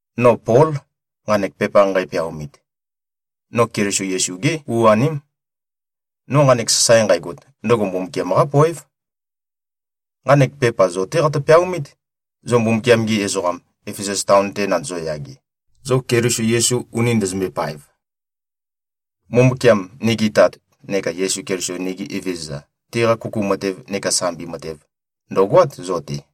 No Pól, nqanek pepa nqæpeaomit. No Keliso Yesu-gé u-aném. No nqanek sasae nqægot, ndøgo Mbumbukiam-qá poév. Nqanek pepa zo-té qatø-peaomít, zo Mbumbukiam-gi ezoqam, Efesus taon-te nandozo-yage, zo Keliso Yesu uni ndøzømbøe-paev. Mbumbukiam, nigi Tat, neka Yesu Keliso, nigi Evezøza, tiqa kuku matev neka sambi matev, ndø̀goát zo-te.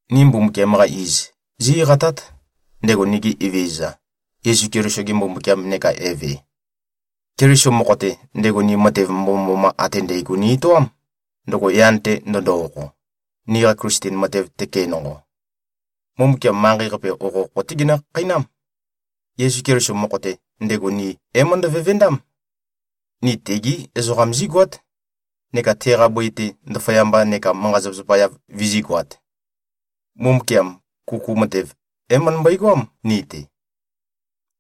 Ni Mbumbukiam-qa iz, zí-eqatát, ndego nigi Evezøza Yesu Keliso-ge Mbumbukiam neka Eve. Keliso mokho-te, ndego ni matev mbomømboma ate ndægo ni-etoám, ndøgo yan-te ndøndo-okho, niqa Klisten matev tøke nonqo. Mbumbukiam manqei-qape, okhokho-té genø-khakheinám. Yesu Keliso mokho-te, ndego ni é-møndø-vevendám. Ni tegí ezoqam zígoát, neka teqa bøi-te ndaføyamba neka manqa-zapa-yav vizígoāt. Mbumbukiam kuku matev, é-møndømbøe-goám ni-te.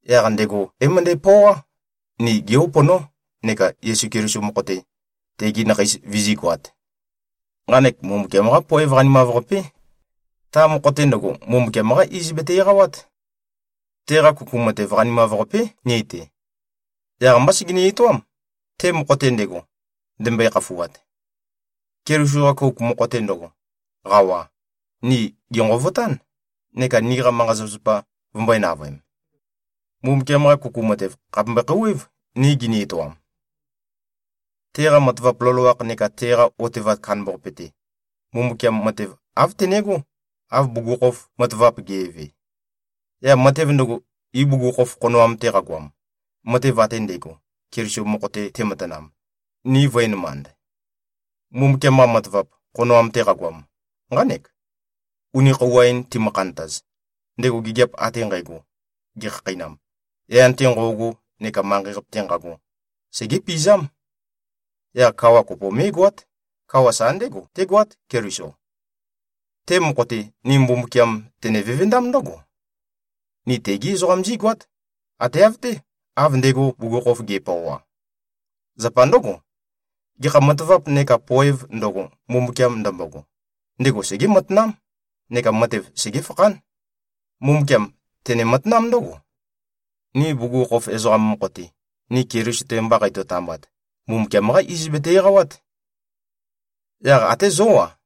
Yaq ndego é-møndæpøoá, ni gé-uponó, neka Yesu Keliso mokho-te, tegi nakheis vizígoāt. Nqanek Mbumbukiam-qá poev qanimav-qapé. Ta mokho-te ndøgo, Mbumbukiam-qá iz bete-eqawát. Teqa kuku matev qanimav-qapé, ni-te. Yaq-mbá segeni-etoám, te mokho-te ndego, ndembøe-khafuat. Keliso-qa kouk mokho-te ndøgo, qawa, ni gènqovotán, neka niqa manqa-zapazapa vømbø̄e-navøem. Mbumbukiam-qa kuku matev, khàpe mbøe-khouwév, ni gini-etoam. Teqa matavap loloakh neka teqa otevat kandambaqape-te, Mbumbukiam matev āv tenegó, av bugukhokhof matavap ge꞉ve. Yaq matev ndøgo, ibugukhokhof khonoam-te qagoam, matev ate ndægo, Keliso mokho-te tematanam, ni vø̄enømand. Mbumbukiam-qa matavap, khonoam-te qagoam, nqánek: Uni khøuwa-in timø-khantaz, ndego gigiap ate nqægo gekhakheinam, yan-te nqo꞉go neka manqei-qape-te nqago, segépizám. Yaq kawa kopo mé꞉goát. Kawa sa ndégo, tégoát, Keliso. Te mokho-te, ni Mbumbukiam tene-vevendám ndǿgo: Ni tegé ezoqam zígoát, ate av-té, av ndego bugukhokhof ge꞉pøoa. Zapa ndǿgo, gekha matavap neka poēv ndøgo, Mbumbukiam ndømbogo, ndego segé-matanám neka matev segéfakhán. Mbumbukiam tene-matanám ndǿgo: Ni bugukhokhof ezoqam mokho-te, ni Keliso-te mba qeitø-tambat, Mbumbukiam-qá iz bete-eqawát. Yaq até zó-a,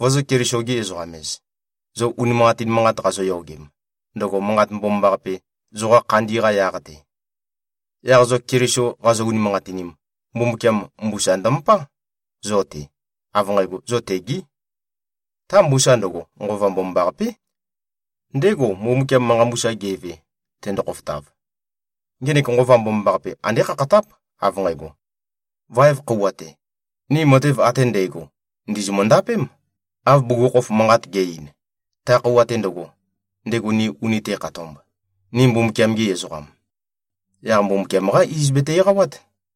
vozō-Keliso-gi-ezoqam-ez, zo unimanqatin manqat qazoyogem, ndøgo Manqat Mbomambaqape, zoqa khandi-qa yaq-te. Yaq zo Keliso qazo-unimanqatinim, Mbumbukiam mbusa ndømøpá, zo-te, av nqægo, zo tegí. Ta mbusa ndøgo, Nqova Mbomambaqapé. Ndégo, Mbumbukiam manqa mbusa ge꞉ve, tendo-khofotav. Ngenek Nqova Mbomambaqape, andé khakhatáp, av nqægo, vaev khøuwa-te, ni matev ate ndægo ndìzimø-ndapém, av bugukhokhof manqat ge꞉-ein, ta khøuwa-te ndøgo, ndego ni uni te꞉khatomb, ni Mbumbukiam-gi ezoqam. Yaq Mbumbukiam-qá iz bete-eqawát.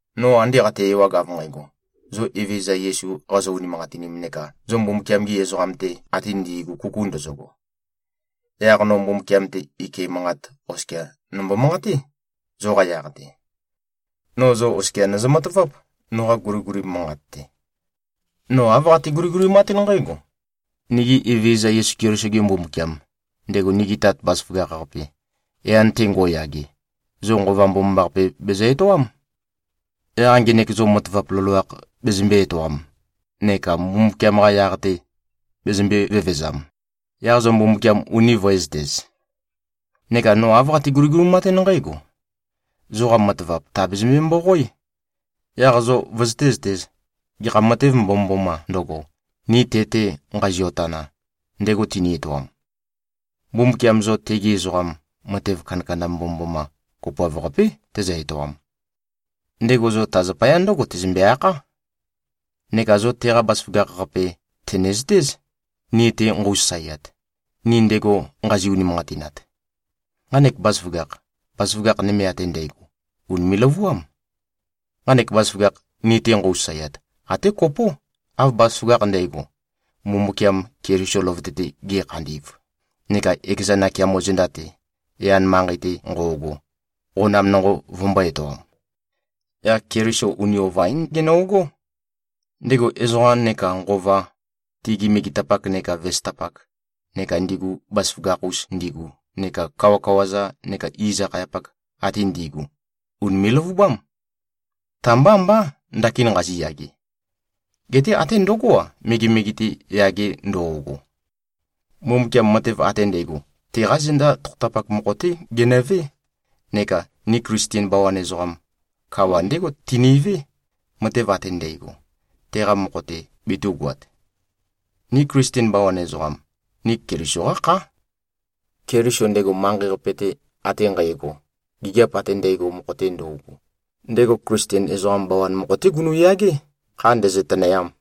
No ande qate-ewag av nqægo, zo Evezøza Yesu qazo-unimanqatinim neka zo Mbumbukiam-gi ezoqam-te ate ndi꞉gu kuku ndøzøgo, yaq no Mbumbukiam-te ike manqat oskia nombo-manqaté, zoqa yaq-te. No zo oskia nøzø-mataváp, noqa guliguli manqat-te. No āv qate-guligulimatún nqǽgo: Nigi Evezøza Yesu Keliso-ge Mbumbukiam, ndego nigi Tat bazaføgakh-qape, yan-te ngo꞉yage, zo Nqova Mbomambaqape bezø-etoám. Yaq ngenek zo matavap loloakh bezømbē-etoam neka Mbumbukiam-qa yaq-te bezømbē-vevezam, yaq zo Mbumbukiam uni vø̄ezøtez. Neka no āv qate-guligulimatún nqǽgo: Zoqa matavap tàbezømbe-mboqoé. Yaq zo vøzøté-zøtēz, gekha matev mbomømbomā ndøgo, ni te-te nqazio-tana, ndego tini-etoam. Mbumbukiam zo tegi ezoqam, matev kandakanda mbomømboma kopoav-qapé tezø-etoam. Ndego zo ta zapaya ndǿgo tezømbe-akhá. Neka zo teqa bazaføgakh-qape tø̀nezøtéz, ni-te nqøu-sasaeat, ni ndego nqazi-unimanqatinat. Nqanek bazaføgakh, bazaføgakh nøme ate ndægo, ùnime꞉-løvuám. Nqanek bazaføgakh, ni-te nqøu-sasaeat, até kopó, av bazaføgakh ndægo, Mbumbukiam Keliso løvøte-te ge꞉khandi꞉v neka ekeza nakeamo zenda-te, yan manqei-te nqo꞉go, qonam nonqo vømbō-etoam. Yaq Keliso uni ova-ín gono꞉gó. Ndego ezoqa nekā nqova, tigi megetapak neka vesøtapak, neka ndigu bazaføgakh-us ndigu neka kawakawa-za neka iz-akhayapak ate ndi꞉gu, ùnime꞉-løvubám. Ta-mbá mbá, ndakin nqaziyage. Geté até ndøgó-a, megemege-te yage ndo꞉go. Mbumbukiam matev ate ndægo, teqá zenda tokhotapak mokho-té genøvé, neka ni Klisten bawan ezoqam, kawa ndégo tinivé, matev ate ndægo, teqa mokho-te betū꞉goat. Ni Klisten bawan ezoqam, ni Keliso-qá khá. Keliso, ndego manqei-qape-te ate nqægo, gigiap ate ndægo mokho-te ndøugu, ndego Klisten bawan ezoqam mokho-té gunu꞉yagé, kha ndēzø̄-tø̄nø̄yām.